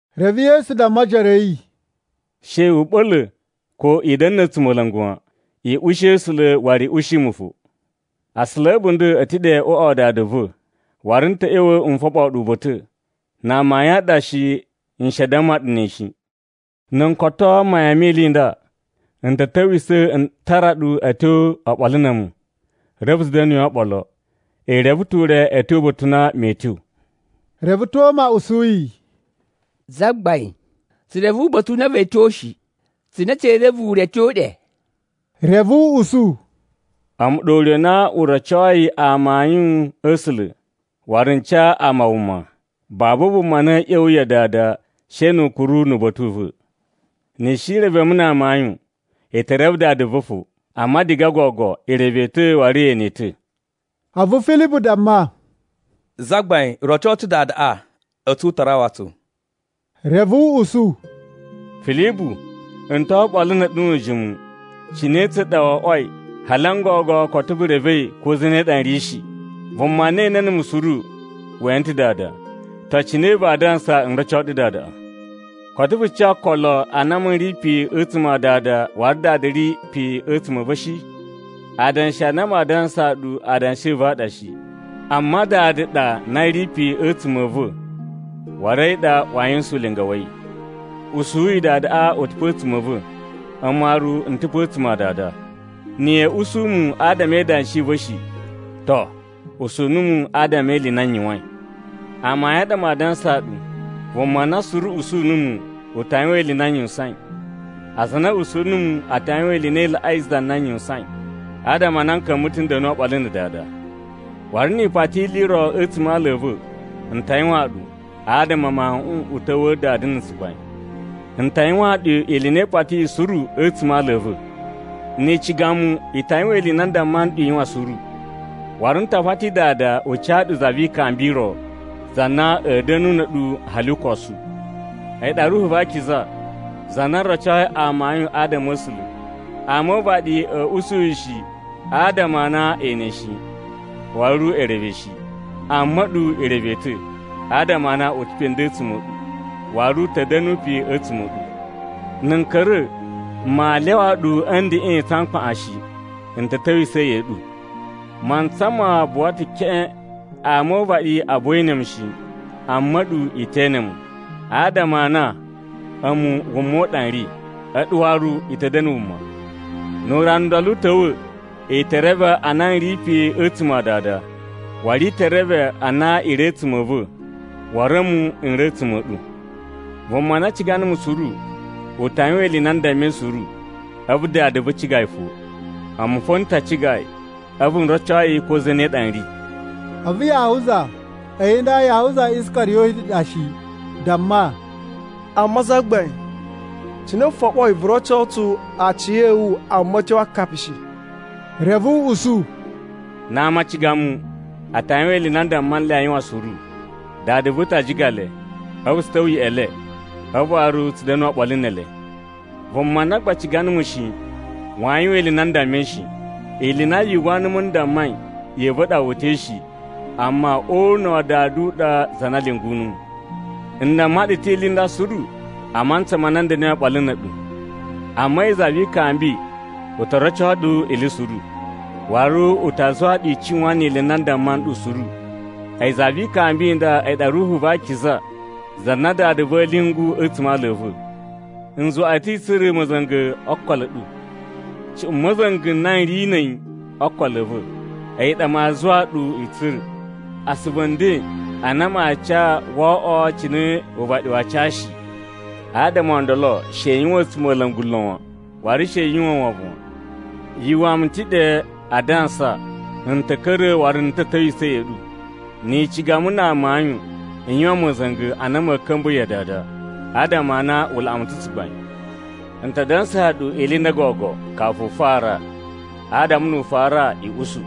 Reve Yesu damma ojoro a̱ yi, “She u ɓa̱la̱ ko i da̱na̱ na̱ a̱tsumola̱ngu wan. I ushi A̱sula̱, waru i ushi mu fo. Asula a̱ a̱bunda̱ a̱ ta̱ ɗe o uꞌwa wa Dada va̱, waru n ta̱ ꞌya̱wa̱ n foɓoo ɗu uba̱ta̱. Na amayun a ɗa shi, n shi a damma ɗu ne shi. Na̱ n koto mayan me ili i nda, n ta̱ ta̱wisa̱ n tara ɗu a̱ tyo oɓolo na̱ a̱mu. Reve tsu da̱nuyi oɓolo. I reve ta̱ ure a̱ tyo uba̱ta̱ u na mee tyo.” Reve Toma usu yi, “Zagbain, tsu reve uba̱ta̱ u na vee tyo shi. Cine tsee reve ure a̱ tyo ɗe?” Reve u usu, “A̱mu ɗa ure u na u rocoi amayun a̱ A̱sula̱ waru n ca ama wuma. Babu vuma na a̱a̱ ꞌya̱wa̱ ya Dada she nu u kuru nu uba̱ta̱ u va̱. Ni i shi i reve mu na amayun, i te reve Dada va̱ fo. Amma diga gogo i reve yi ta̱, waru ye ene yi ta̱.” A̱vu Filibu damma, “Zagbain, roco tsu Dadaꞌa, a̱tsu u ta rawa tsu.” Reve u usu, “Filibu, n to oɓolo na̱ a̱ɗu nu ujimu. Cine tsa ɗa wo oꞌwoi hali n gogo koto vu revei ko zane ɗa n ri shi? Vuma na ene numu suru, we ene ta̱ Dada. To, cine vaa dansa n roco ɗu Dadaꞌa. Koto vu ca okolo a na a̱mu n ri pe a̱tsuma̱ a Dada, waru Dada ri pe a̱tsuma̱ a̱ va̱ shi? Adanshi a na maa dansaa ɗu adanshi a̱ va̱ a ɗa shi, amma Dada ɗa na ri pe a̱tsuma̱ a̱ va̱, waru a̱yi ɗa waa yuwusan ulinga wa̱ yi. Usuyi Dadaꞌa u ta̱ pe a̱tsuma̱ a̱ va̱, a̱mu waru n ta̱ pe a̱tsuma̱ a Dada. Na̱ ya̱a̱ usu mu adama e idanshi i va̱ shi, to, usu numu adama e ili i na n yuwain. “Amayun a ɗa maa dansaa ɗu, vuma na suru usu numu, ta yuwan ili i na n yuwusain. Aza a na a̱ usu numu a ta yuwan ili i na i laꞌai za na n yuwusain, adama a na n ta̱ ka̱mba̱ n da̱nu oɓolo na̱ Dada. Waru ni i pati ili i ro a̱tsuma̱ a ala a̱ va̱, n ta yuwaan ɗu, adama Mawuꞌun u ta̱wa̱a̱ Dada na̱ tsugbain. N ta yuwaan ɗu ili i na i patiyi suru a̱tsuma̱ a ala a̱ va̱. “Ni i ciga mu, i ta yuwan ili i na n damma nɗu i yuwan suru. Waru n ta pati Dada u ca ɗu Za vi Ikambi i ro, za na a̱a̱ da̱nu na̱ a̱ɗu hali ukosu. A̱yi ɗa Ruhu va Akiza, za na rocoi amayun adama a̱ A̱sula̱. Ama o uvaɗi a̱a̱ usu yi shi, adama a na e ene yi shi, waru e reve yi shi. Amma a̱ɗu i reve yi ta̱, adama a na u ta̱ pe nden a̱tsuma̱ a̱ ɗu, waru u ta̱ da̱na̱ pe a̱tsuma̱ a̱ ɗu. Na̱ n ka̱ra̱, maa lyawa ɗu a̱ ndeꞌen tsa mkpaꞌan shi, n ta̱ ta̱wisa̱ ya̱ꞌa̱ ɗu. Mantsa ma buwa ta̱ keꞌen, ama o uvaɗi a buwa ee ene mu shi, amma a̱ɗu i te ene mu. Adama a na a̱mu wuma u ɗa n ri, a̱ɗu waru i ta̱ da̱na̱ wuma. Nu urana u ndolo u ta̱wa̱, i te reve a na n ri pe a̱tsuma̱ a Dada. Waru i te reve a na i ri a̱tsuma̱ a̱ va̱, waru a̱mu n ri a̱tsuma̱ a̱ ɗu. Vuma na ciga numu suru, u ta yuwan ili i na n dammai suru, a̱vu Dada va̱ ciga yi fo. A̱mu fo n ta ciga yi, a̱vu n roco yi ko zane ɗa n ri.” A̱vu Yahuza (a̱yi nda Yahuza Iskariyoti ɗa shi) damma, “Amma Zagbain, cine vu foɓoi vu roco tsu aciya̱wu amma a̱ tyo a akapi shi?” Reve u usu, “Na ama a ciga mu, a ta yuwan ili i na n damma nle a yuwan suru. Dada va̱ ta ciga le, a̱vu tsu ta̱wa̱ ya̱ꞌa̱ le, a̱vu waru tsu da̱nu oɓolo ne ele. Vuma na gba ciga numu shi, waa yuwan ili i na n dammai shi. Ili i na yu uwwa numu n dammai, ya̱ꞌa̱ va̱ ɗa wu uta̱i shi, amma o una̱ wa Dada u ɗa za na lyungu numu. “N damma ɗu ta̱ ili i nda suru a mantsa ma na n da̱na̱i oɓolo na̱ a̱ɗu. Amma a̱yi Za vi Ikambi u to roco ɗu ili suru, waru u ta zuwa ɗu i cuwan ili i na n damma nɗu suru. A̱yi Za vi Ikambi i nda a̱yi ɗa Ruhu va Akiza za na Dada va̱ a̱a̱ lyungu a̱tsuma̱ a ala a̱ va̱. N zuwa ɗu ta̱ i tsura̱ ma̱za̱nga̱ o okolo a̱ ɗu, cuꞌun ma̱za̱nga̱ na n ri na̱ a̱yi o okolo a̱ va̱, a̱yi ɗa maa zuwa ɗu i tsura̱. Asuvu nden a na maa ca woo oꞌwo cine uvaɗi waa ca shi. Adama o ndolo she i yuwan a̱tsumola̱ngu lon wan, waru she yu uwwa wovon wan. “Yu uwwa mu ta̱ ɗe adansa n ta̱ ka̱ra̱ waru n ta̱ ta̱wisa̱ ya̱ꞌa̱ ɗu. Ni i ciga mu na amayun i yuwan ma̱za̱nga̱ a na ma̱a̱ ka̱mba̱ ya Dada, adama a na u laꞌa mu ta̱ tsugbain. N ta dansaa ɗu ili i nda gogo kafu u fara, adama nu u fara i usu.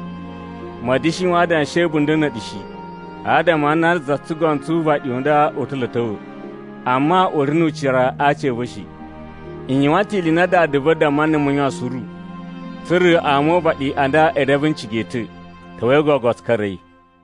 Ma̱a̱ da̱shi yuwan adanshi a̱ a̱bunda̱ na̱ a̱ɗu shi. Adama a na za tsugono tsu uvaɗi u nda u ta̱ lo a̱ ta̱wa̱. Amma u ri nu ucira a aci a̱ va̱ shi. N yuwan ta̱ ili i na Dada va̱ damma numu n yuwan suru, tsa̱ra̱ ama o uvaɗi a nda e reve n ciga yi ta̱. “Ta̱wa̱i gogo tsu ka̱ra̱i.”